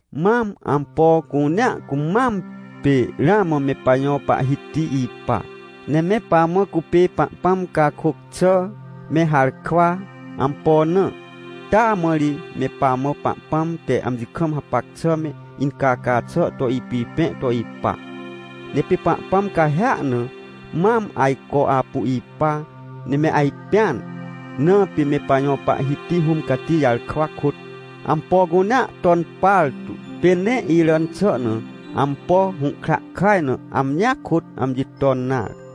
Mam, ampo cunea cumam, pê ramã me pajõ Pahhiti ipa. Ne me pamã cupê Pahpãm cakôc xà me harkwa. Ampo na? Taa mã ri me pamã Pahpãm te amji kam hapac xà me, incaca xà to ipipẽ to ipa. Ne pê Pahpãm cahêa na maam ajco apu ipa ne me ajpẽan. Na pê me pajõ Pahhiti Hũm Cati jarkwa kôt ampo cunea ton partu, pê nee iràn xà na, ampo hũhkra kaj na, amjia kôt amji ton nare.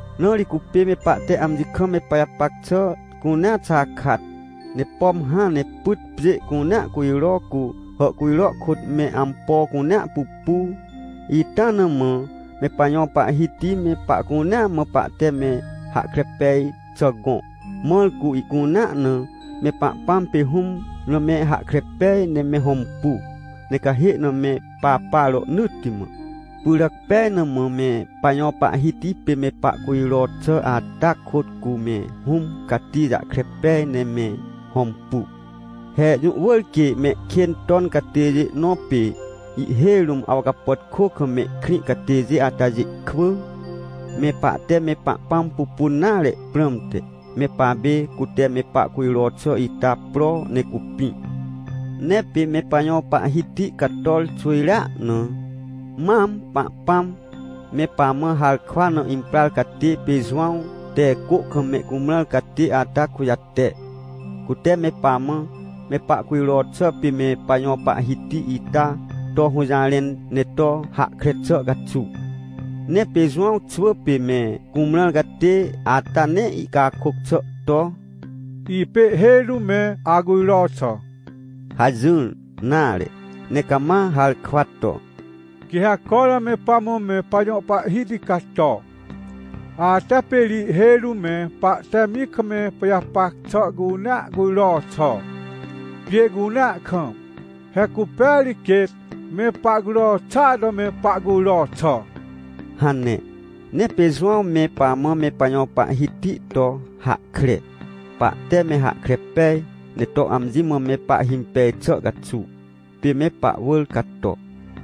Na ri cupê me pahte amji kam me pajapac xà cunea xakat. Ne pom hãn ne pyt pjê cunea cujro, cu hàhcujro kôt me ampo cunea pupu, ita na mã me pajõ Pahhiti me pahcunea mã pahte me hahkre pej xà gõ, mãr cu ihcunea na me Pahpãm pê Hũm na me hahkre pej ne me hõmpu, ne cahê na me papa rohnỳtti mã. Pyràc pej na mã me pajõ Pahhiti pê me pahcujro xà, ata kôt cu me Hũm Cati jahkre pej ne me hõmpu. He jũ wỳr quê mehkên ton catêjê nõ, pê ihhêj rũm awcapàtkô kam mehkrĩ catêjê atajê kwỳ, me pahte me Pahpãm pupun nare prãmte, me papê cute me pahcujro xà ita pro ne cupĩ. Ne pê me pajõ Pahhiti cator xwỳjrea na, mam Pahpãm me pamã harkwa na imprar catê pê Jowãw te cô kam me cumrãr catê ata kujate, cute me pamã me pahcujro xà pê me pajõ Pahhiti ita to hũjarẽn, ne to hahkre xà caxuw. Ne pê Jowãw xwỳ pê me cumrãr catê ata nee ihcakôc xà to: — Ipê ihhêj rũm me acujro xà — hajỹr nare, ne cama harkwa to: — Quê ha cormã me pamã me pajõ Pahhiti cato, ata pê ri ihhêj rũm me pahte amji kam me pajapac xà cunea cujro xà, pjê cunea kam. He cupêa ri quêt me pahcujro xàa to me pahcujro xà — hane. Ne pê Jowãw me pamã me pajõ Pahhiti to hahkre, pahte me hahkre pej ne to amji mã me pahhimpej xà caxuw, pê me pahwỳr cato.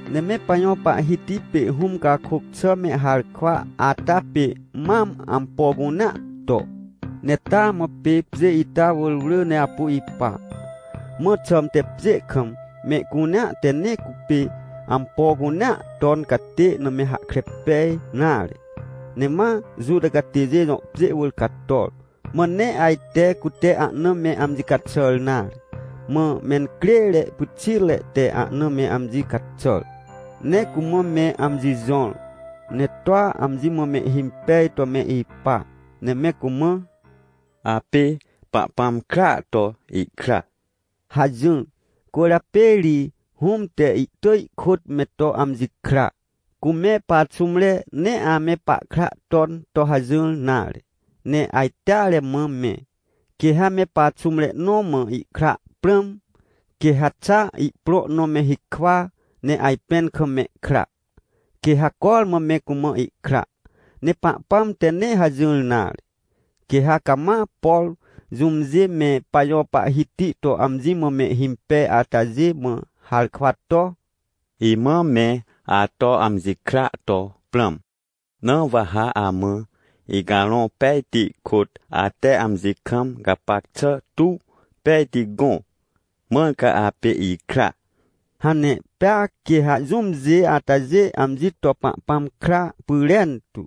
Ne me pajõ Pahhiti pê Hũm cakôc xà me harkwa ata pê mam ampo cunea to, ne taa mã pê pjê ita wỳr wrỳ ne apu ipa. Mã xãmte pjê kam mehcunea te nee cupê ampo cunea ton catê na me hahkre pej nare. Ne ma Juta catêjê jõ pjê wỳr cator, mã nee ajte cute ahna me amji caxàr nare. Mã mencrêre pyxitre te ahna me amji caxàr, ne cumã me amji jõr, ne toa amji mã mehhimpej to me ipa, ne me cumã: — Apê Pahpãm kraa to ihkra — hajỹr. Cwỳrjapê ri Hũm te ihtỳj ihkôt me to amji kra. Cu me paxũmre nee ame pahkra ton to hajỹr nare, ne ajteare mã me. Quê ha me paxũmre nõ mã ihkra prãm, quê ha xa ihprõ nõ me hikwa, ne ajpẽn kam mehkra, quê ha cormã me cumã ihkra. Ne Pahpãm te nee hajỹr nare. Quê ha cama, por jũmjê me pajõ Pahhiti to amji mã mehhimpej atajê mã harkwa to: — Imã me ato amji kra to prãm. Na wa ha amã Icarõ Pejti kôt, ate amji kam gapac xà tuw pejti gõ, mãr ca apê ikra — hane. Pea quê ha jũmjê atajê amji to Pahpãm kra pyrentu.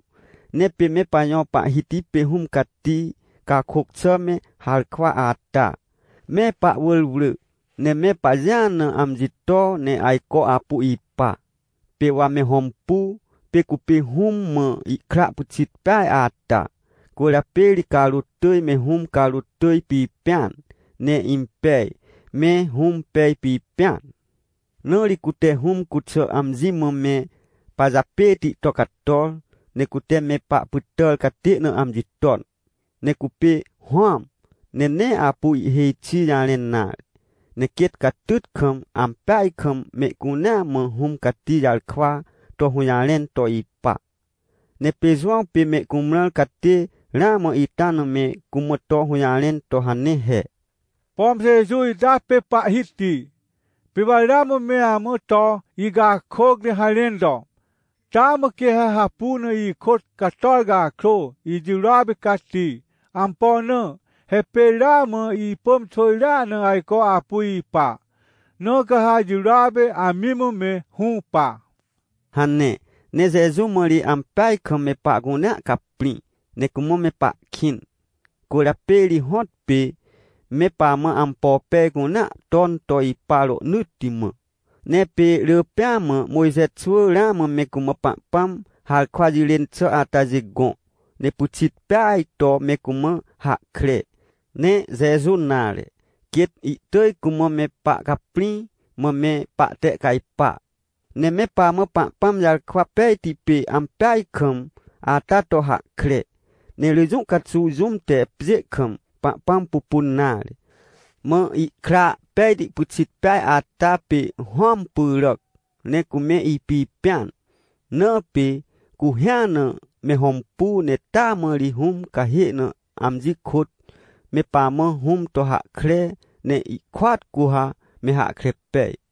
Ne pê me pajõ Pahhiti pê Hũm Cati cakôc xà me harkwa ata, me pahwỳr wrỳ, ne me pajĩa na amji to, ne ajco apu ipa. Pê wa me hõmpu. Pê cupê Hũm mã ihkra pyxit peaj ata. Cwỳrjapê ri carôt tỳj me Hũm carôt tỳj pipẽan, ne impej me Hũm pej pipẽan. Na ri cute Hũm cuxà amji mã me pajapêti to cator, ne cute me pahpytàr catê na amji ton. Ne cupê Hũam, ne nee apu ihhêj xi jarẽn nare, ne quêt catyt kam, ampeaj kam mehcunea mã Hũm Cati jarkwa to hũjarẽn to ipa. Ne pê Jowãw pê me cumrãr catê ramã ita na me cumã to hũjarẽn to hane he: — Pom Jeju ita pê Pahhiti, pê wa ramã me amã to icakôc ne harẽn to: “Taa mã quê ha hapu na ikôt cator cakrô, ijirôa pê cati. Ampo na? He pê ramã ipỳm xwỳjrea na ajco apu ipa, na ca ha ijirôa pê amji mã me hũpa” — hane. Ne Jeju mã ri ampeaj kam me pahcunea caprĩ, ne cumã me pahkĩn. Cwỳrjapê ri hõtpê me pamã ampo pej cunea ton to ipa rohnỳtti mã. Ne pê rỳ pêa mã Mojxe xwỳ ramã me cumã Pahpãm harkwa jirên xà atajê gõ, ne pyxit peaj to me cumã hahkre. Ne Jeju nare, quêt ihtỳj cumã me pahcaprĩ, mã me pahtehcajpa. Ne me pamã Pahpãm jarkwa pejti pê ampeaj kam ata to hahkre. Ne rỳ jũ caxuw jũm te pjê kam Pahpãm pupun nare. Mã ihkra pejti pyxit peaj ata pê Hũam pyràc ne cume ipipẽan. Na pê cu hĩa na me hõmpu, ne taa mã ri Hũm cahê na amji kôt me pamã Hũm to hahkre, ne ihkôat cu ha me hahkre pej.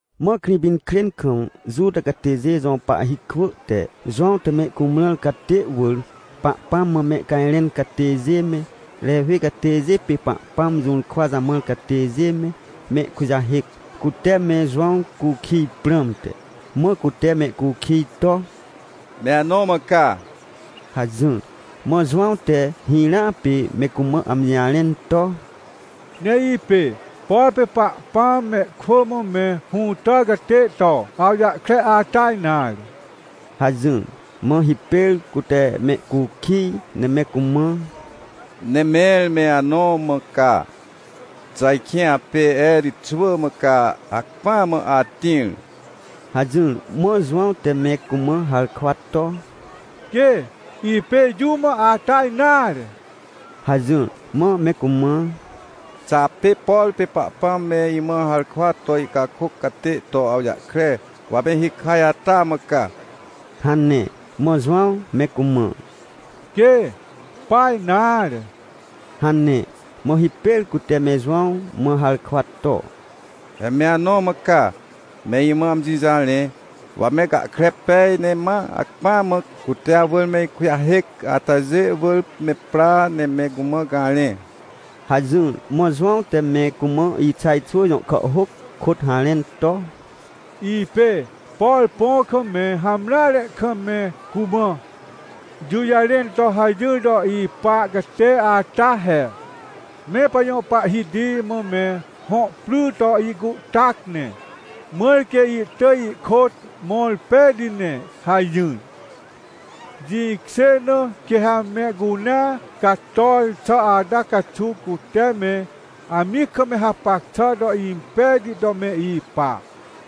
Mã Krĩpinkrên kam Juta catêjê jõ pahhi kwỳ te Jowãw te me cumrãr catê wỳr, Pahpãm mã mehcajrẽn catêjê me, Rewi catêjê pê Pahpãm jũrkwa jamãr catêjê me, mehkujahêc, cute me Jowãw cukij prãmte. Mã cute mehcukij to: — Me anõ mã ca? — hajỹr. Mã Jowãw te hirãa pê me cumã amji jarẽn to: — Nee ipê, por pê Pahpãm mehkwỳ mã me hũtàr catê to awjahkre ata nare — hajỹr. Mã hipêr cute mehcukij ne me cumã: — Ne mẽr me anõ mã ca? Xà ajkĩ apê Erij xwỳ mã ca hacpỹa mã atĩr? — hajỹr. Mã Jowãw te me cumã harkwa to: — Quê, ipê jũm ata nare — hajỹr. Mã me cumã: — Xà apê, por pê Pahpãm me imã harkwa to ihcakôc catê to awjahkre, wa me hikaj ata mã ca? — hane. Mã Jowãw me cumã: — Quê! Pa nare! — hane. Mã hipêr cute me Jowãw mã harkwa to: — He me anõ mã ca? Me imã amji jarẽ. Wa me gahkre pej ne ma hacpỹ mã cute awỳr me ikujahêc atajê wỳr me pra, ne me cumã garẽ — hajỹr. Mã Jowãw te me cumã Ixaj xwỳ jõ kàhhôc kôt harẽn to: “Ipê, por põ kam me hamreare kam me cumã ijũjarẽn to hajỹr to ipa catê ata he: ‘Me pajõ Pahhiti mã me hõ pry to ihcuhtac ne, mãr quê ihtỳj ihkôt mõr pejti ne’ hajỹr. Jĩkjê na quê ha mehcunea cator xà ata caxuw cute me amji kam hapac xà to impejti to me ipa,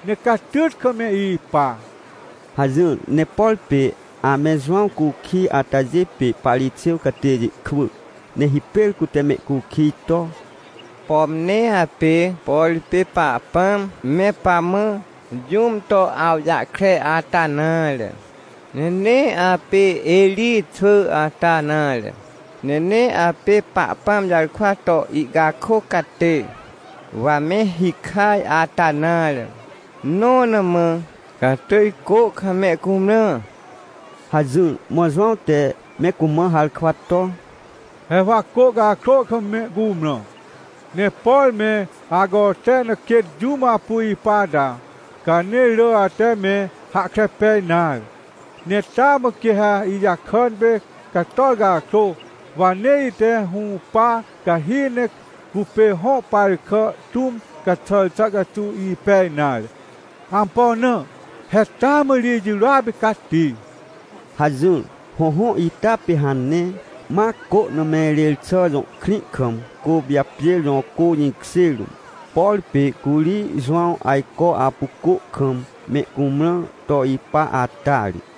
ne catyt kam me ipa” hajỹr. Ne por pê ame Jowãw cukij atajê pê Parixêw catêjê kwỳ. Ne hipêr cute mehcukij to: — Pom nee apê, por pê Pahpãm me pamã jũm to awjahkre ata nare, ne nee apê Erij xwỳ ata nare, ne nee apê Pahpãm jarkwa to ihcakôc catê wa me hikaj ata nare, nõ na mã ca atỳj cô kam me cumrã? — hajỹr. Mã Jowãw te me cumã harkwa to: — He wa cô cakrô kam me cumrã, ne por me acote na quêt jũm apu ipa ata, ca nee rỳ ate me hahkre pej nare. Ne taa mã quê ha ijakàn pê cator cakrô, wa nee ite hũpa cahi ne cupê hõ par kà tũm caxàr xà caxuw ipej nare. Ampo na? He taa mã ri ijirôa pê cati — hajỹr. Hõhõ, ita pê hane, ma Côhnameirêrxà jõ krĩ kam, Côpijapjêr jõ cô jĩkjê rũm. Por pê curi Jowãw ajco apu cô kam me cumrãr to ipa ata ri.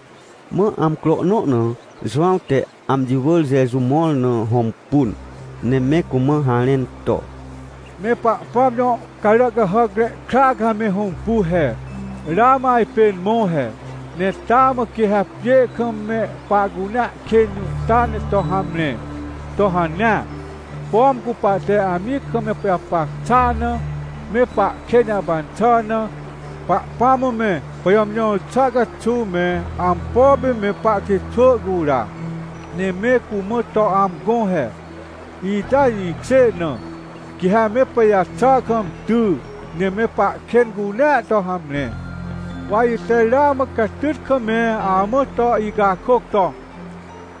Mã amcro nõ na Jowãw te amji wỳr Jeju mõr na hõmpun, ne me cumã harẽn to: — Me Pahpãm jõ Caràcahàcre Kra ca me hõmpu he, ramã ajpên mõ he. Ne taa mã quê ha pjê kam me pahcunea kên jũhta ne to hamre! To hanea, pom cu pahte amji kam me pajapac xàa na, me pahkên jahpan xà na, Pahpãm mã me pajàmjõr xà caxuw me ampo pê me pahkritxwỳ cura, ne me cumã to amgõ he. Ita jĩkjê na, quê ha me pajaxà kam ty, ne me pahkên cunea to hamre. Wa ite ramã catyt kam me amã to icakôc to: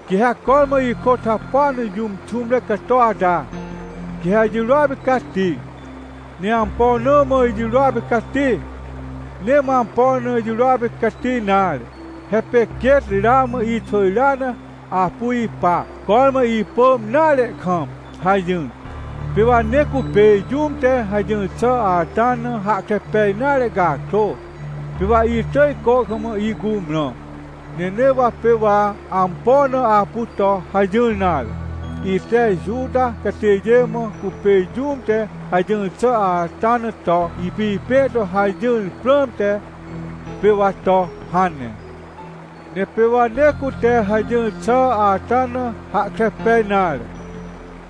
“Quê ha cormã ikôt hapua na jũm xũmre cato ata, quê ha ijirô pê cati. Ne ampo na mã ijirôa pê cati? Nee mã ampo na ijirôa pê cati nare. He pê quêt ramã ixwỳjrea na apu ipa, cormã ipỳm nare kam” hajỹr. Pê wa nee cupê jũm te hajỹr xà ata na hahkre pej nare cakrô, pê wa itỳj cô kam ihcumrã. Ne nee mã pê wa ampo na apu to hajỹr nare. Ite Juta catêjê mã cupê jũm te hajỹr xà ata na to ipipẽ to hajỹar prãmte, pê wa to hane. — Ne pê wa nee cute hajỹr xà ata na hahkre pej nare,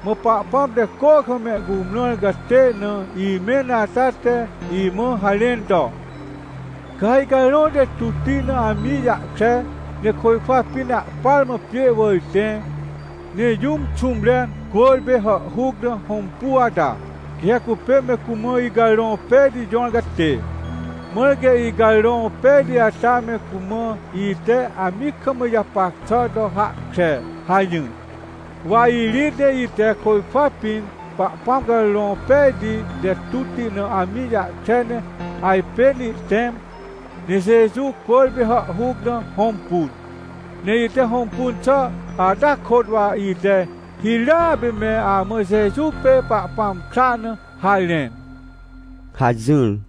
mã Pahpãm te cô kam mehcumrãr catê na imẽn ata te imã harẽn to: “Ca ha Icarõ te tutti na amji jahkre, ne côjkwa pĩn ahpar mã pjê wỳr tẽ, ne jũm xũmre cwỳrpê hàhhuc na hõmpu ata, quê ha cupê me cumã Icarõ Pejti jõr catê. Mãr quê Icarõ Pejti ata me cumã ite amji kam ijapac xà to hahkre” hajỹr. Wa irĩt, ne ite côjkwa pĩn Pahpãm Carõ Pejti te tutti na amji jahkre ne ajpên ihtẽm, ne Jeju cwỳrpê hàhhuc na hõmpun. Ne ite hõmpun xà ata kôt wa ite hirãa pê me amã Jeju pê Pahpãm kra na harẽn — hajỹr.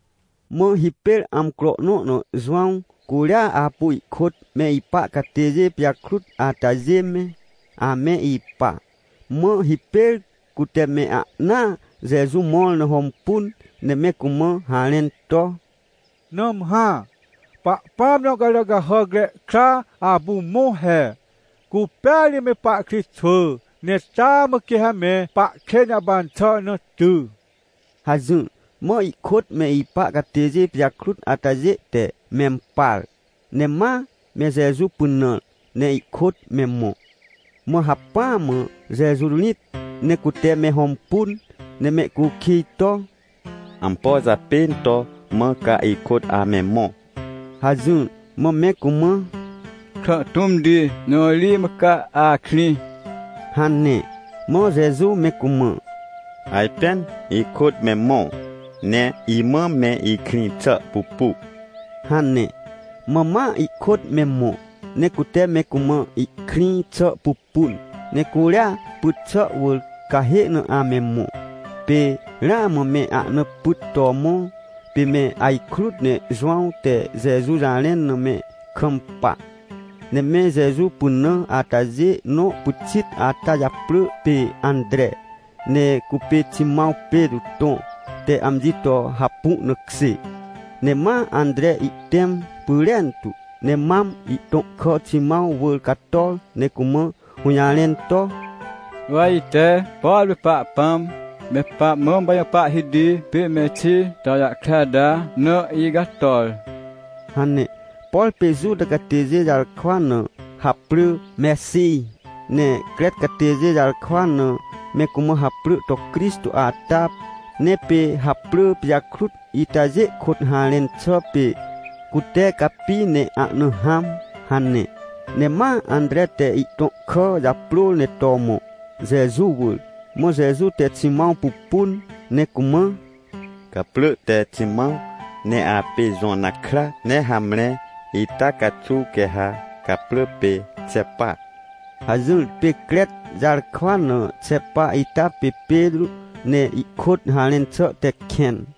Mã hipêr amcro nõ na Jowãw curia apu ihkôt me ipa catêjê pijakrut atajê me, ame ipa. Mã hipêr cute me ahnaa Jeju mõr na hõmpun, ne me cumã harẽn to: — Nãmhã, Pahpãm jõ Caràcahàcre Kra apu mõ he! Cupêa ri me pahkritxwỳ, ne taa mã quê ha me pahkên jahpan xà na ty — hajỹr. Mã ihkôt me ipa catêjê pijakrut atajê te mempar, ne ma me Jeju pynãr ne ihkôt me mõ. Mã hacpỹ mã Jeju rĩt, ne cute me hõmpun, ne mehcukij to: — Ampo japên to mã ca ikôt ame mõ? — hajỹr. Mã me cumã: — Ikrã tũmti, jõ ri mã ca akrĩ? — hane. Mã Jeju me cumã: — Ajpên ikôt me mõ, ne imã me ikrĩ xà pupu — hane. Mã ma ihkôt me mõ, ne cute me cumã ihkrĩ xà pupun. Ne curia pyt xà wỳr, cahê na ame mõ, pê ramã me ahna pyt to mõ. Pê me ajkrut ne Jowãw te Jeju jarẽn na me kampa, ne me Jeju pynã atajê nõ pyxit ata japrỳ pê Antre, ne cupê Ximãw Petrô tõ te amji to hapu na kjê. Ne ma Antre ihtẽm pyrentu, ne mam ihtõ kà Ximãw wỳr cator ne cumã hũjarẽn to: — Wa ite, por pê Pahpãm me pamã me pajõ Pahhiti pê Mexij to awjahkre ata na icator — hane. Por pê Juta catêjê jarkwa na haprỳ Mexij, ne Crec catêjê jarkwa na me cumã haprỳ to Crixtô ata. Ne pê haprỳ pijakrut itajê kôt harẽn xà pê “Cute capi ne ahna hãm” hane. Ne ma Antre te ihtõ kà japrôr ne to mõ, Jeju wỳr. Mã Jeju te Ximãw pupun ne cumã: — Gaprỳ te Ximãw, ne apê Jona kra, ne hamre ita caxuw quê ha gaprỳ pê Xepa — hajỹr. Pê Crec jarkwa na Xepa ita pê Petrô, ne ihkôt harẽn xà te “Kẽn”.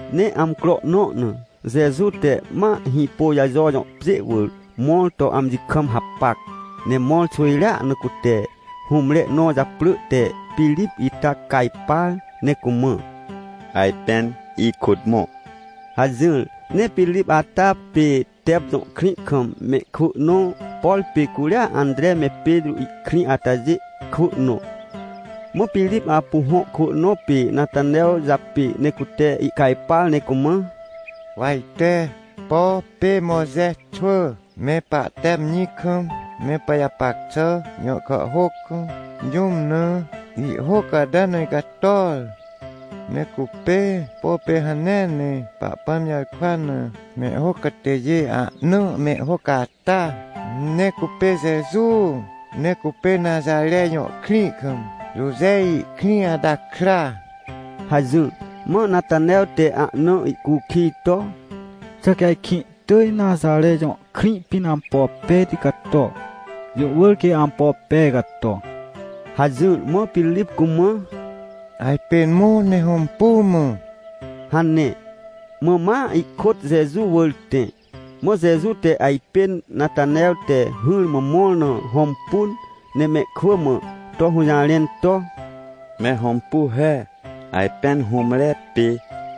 Ne amcro nõ na Jeju te ma Hĩpôjajo jõ pjê wỳr mõr to amji kam hapac. Ne mõr xwỳjrea na cute hũmre nõ japrỳ te Pirip ita cajpar ne cumã: — Ajpên ikôt mõ! — hajỹr. Ne Pirip ata pê Tep jõ krĩ kam mehkwỳ nõ, por pê curi Antre me Petrô ihkrĩ atajê kwỳ nõ. Mã Pirip apu hõ kwỳ nõ pê Natanew japê, ne cute ihcajpar ne cumã: — Wa ite, por pê Mojxe xwỳ me pahte amji kam me pajapac xà jõ kàhhôc kam, jũm na ihhôc ata na icator. Ne cupê, por pê hanea ne Pahpãm jarkwa na mehhôc catêjê ahna mehhôc ata! Ne cupê Jeju, ne cupê Naxare jõ krĩ kam, Joje ihkrĩ ata kra — hajỹr. Mã Natanew te ahna ihcukij to: — Xà quê ajkĩ ihtỳj Naxare jõ krĩ pĩn ampo pejti cato? Jũ wỳr quê ampo pej cato! — hajỹr. Mã Pirip cumã: — Ajpên mõ ne hõmpu mã — hane. Mã ma ihkôt Jeju wỳr tẽ. Mã Jeju te ajpên Natanew te hỹrmã mõr na hõmpun, ne mehkwỳ mã to hũjarẽn to: — Me hõmpu he! Ajpên hũmre pê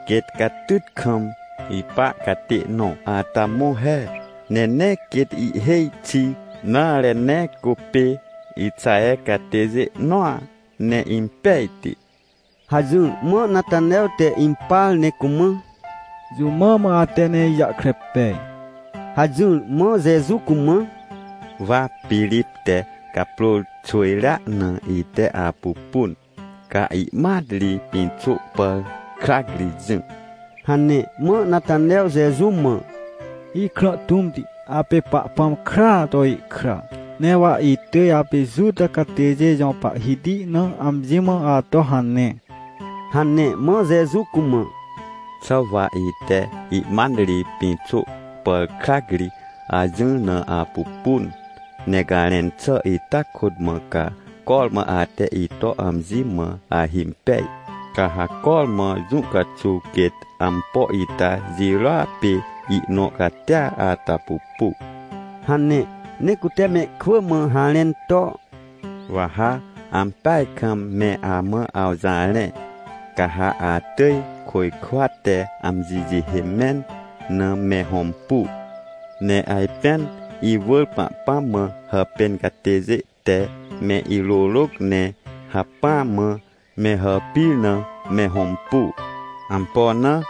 quêt catyt kam ipa catê nõ ata mõ he. Ne nee quêt ihhêj xi nare, ne cupê Ixaher catêjê nõa, ne impejti! — hajỹr. Mã Natanew te impar ne cumã: — Jũ mã mã ate ne ijahkre pej? — hajỹr. Mã Jeju cumã: — Wa Pirip te gaprôr xwỳjrea na ite apupun, ca ihmat ri pĩxô pàr krac ri jỹ — hane. Mã Natanew Jeju mã: — Ikrã tũmti, apê Pahpãm kraa to ihkra! Ne wa itỳj apê Juta catêjê jõ Pahhiti na amji mã ato hane! — hane. Mã Jeju cumã: — Xà wa ite ihmat ri pĩxô pàr krac ri ajỹr na apupun ne garẽn xà ita kôt mã ca cormã ate ito amji mã ahimpej? Ca ha cormã jũ caxuw quêt ampo ita jirôa pê ihnõ catia ata pupu — hane. Ne cute mehkwỳ mã harẽn to: — Wa ha ampeaj kam me amã awjarẽ, ca ha atỳj côjkwa te amji jihê mẽn na me hõmpu, ne ajpên iwỳr Pahpãm mã hàpên catêjê te me irôrôc, ne hacpỹ mã me hàpir na me hõmpu. Ampo na?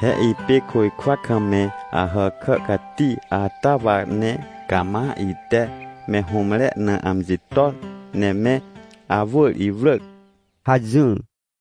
He ipê côjkwa kam me Ahàkà cati ata wa, ne cama ite me hũmre na amji ton ne me awỳr iwrỳc — hajỹr.